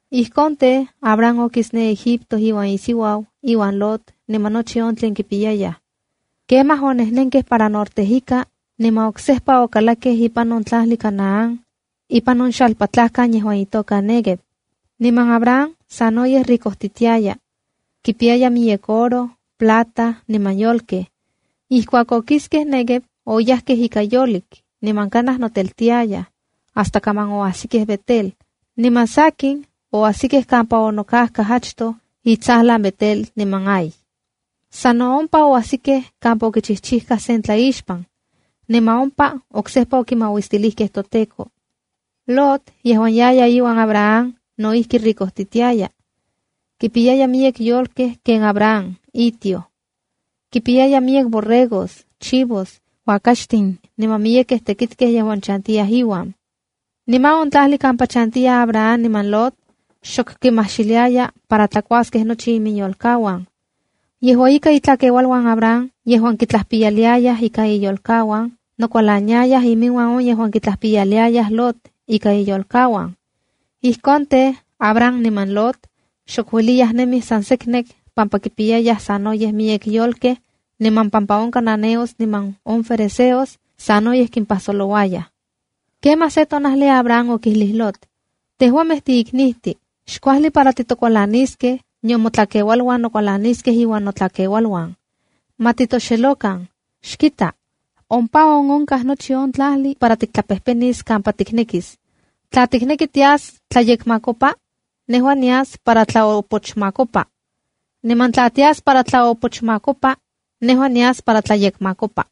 Ijkon tej, Abram okis ne Egipto iuan isiuau, iuan Lot niman nochi on tlen kipiyayaj. Kemaj onejnenkej para norte ika, niman oksejpa okalakkej ipan on tlajli Canaán ipan on xalpatlakan yejuan itoka Neguev. Niman Abram sanoyej yoricojtiaka. Kipiyaya miyek oro, plata niman yolkej. Ijkuak okiskej Neguev, oyajkej ika yolik niman kanaj noteltiayaj, hasta kaman oajsikej Betel. Niman sakin, oajsikej kampa onokajkaj achtoj itsajlan Betel niman Hai. Sa no ompa oajsikej kampa okichijchijka sen tlaixpan. Niman ompa oksejpa okimauistilij toTEKO. Lot yejuan yaya iuan Abram. No ijki yoricojtiaka. Kipiyaya miyek yolkej ken Abram on itioj. Kipiyaya miyek borregos, chivos, uakaxtin niman miyekej tekitkej yejuan chantiyaj inuan. Niman on tlajli kampa chantiyaj Abram niman Lot, xok kimajxiliaya para tlakuaskej nochi iminyolkauan. Yejua ika, itlakeualuan Abram yejuan kitlajpiyaliayaj ika iyolkauan nokualaniayaj iminuan on yejuan kitlajpiyaliayaj Lot ika iyolkauan. Ijkon tej, Abram niman Lot xok ueliyaj nemij san seknek pampa kimpiyayaj sanoyej miyek yolkej niman pampa on cananeos niman ferezeos sanoyej kimpajsolouayaj. Kemaj se tonajli Abram okijlij Lot: “Tejuamej tiiknijtin. Xkuajli para titokualaniskej, nion motlakeualuan nokualaniskej iuan notlakeualuan. Ma titoxelokan. Xkita, ompa on onkaj nochi on tlajli para tiktlapejpenis kampa tiknekis. Tla tikneki tias tlayekmakopa, nejua nias para tlaopochmakopa. Niman tla tias para tlaopochmakopa, nejua nias para tlayekmakopa.”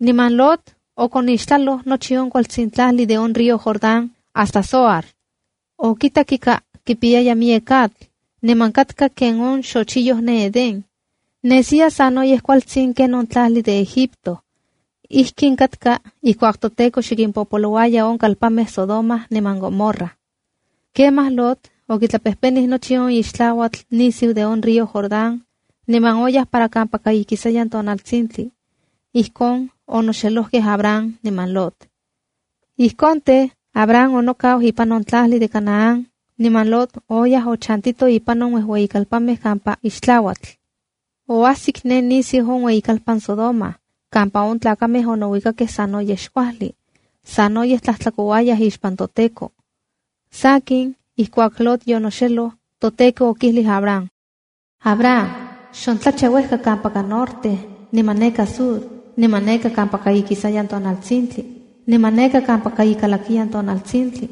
Niman Lot okonixtlaloj nochi on kualtsin tlajli de on río Jordán hasta Zoar. Okitak ika kipiyaya miyek atl, niman katka ken on xochiyoj ne Eden. Nesiya sanoyej kualtsin ken on tlajli de Egipto. Ijkin katka ijkuak toTEKO xe kimpopolouaya on kalpanmej Sodoma niman Gomorra. Kemaj Lot okitlapejpenij nochi on ixtlauatl nisiu de on río Jordán, niman oyaj para kampaka ikisayan tonaltsintli. Ijkon onoxelojkej Abram niman Lot. Ijkon tej, Abram onokau ipan on tlajli de Canaán niman Lot oyaj ochantito ipan on uejueyikalpanmej kampa ixtlauatl. Oajsik ne nisiu on ueyikalpan Sodoma, kampa on tlakamej onouikakej sanoyej xkuajli. Sanoyej tlajtlakouayaj ixpan toTEKO. Sakin, ijkuak Lot yonoxeloj, toTEKO okijlij Abram: “Abram, xontlacha uejka kampaka norte niman neka sur, niman neka kampaka ikisayan tonaltsintli, niman neka kampaka ikalakiyan tonaltsintli.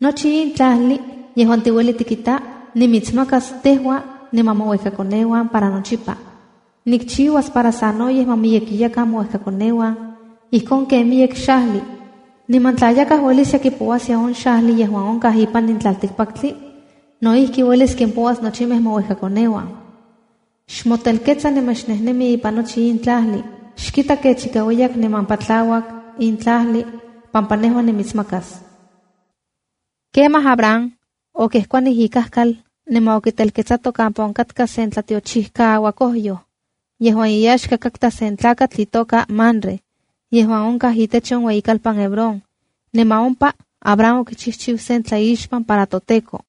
Nochi in tlajli yejuan tiueli tikita, nimitsmakas tejua niman mouejkakoneuan para nochipa. Nikchiuas para sanoyej ma miyekiyakan mouejkakoneuan ijkon ken miyek xajli. Niman tla yakaj ueliskia kipouaskia on xajli yejuan onkaj ipan in tlaltikpaktli, no ijki uelis kimpouas nochimej mouejkakoneuan. Xmotelketsa niman xnejnemi ipan nochi in tlajli. Xkita kech ika ueyak niman patlauak in tlajli pampa nejua nimitsmakas.” Kemaj Abram okejkuanij ikal niman okitelketsato kampa onkatka sen tlatiochijkaauakojyoj yejuan iyaxka katka sen tlakatl itoka Mamre yejuan onka itech on ueyikalpan Hebrón. Niman ompa Abram okichijchiu sen tlaixpan para toTEKO.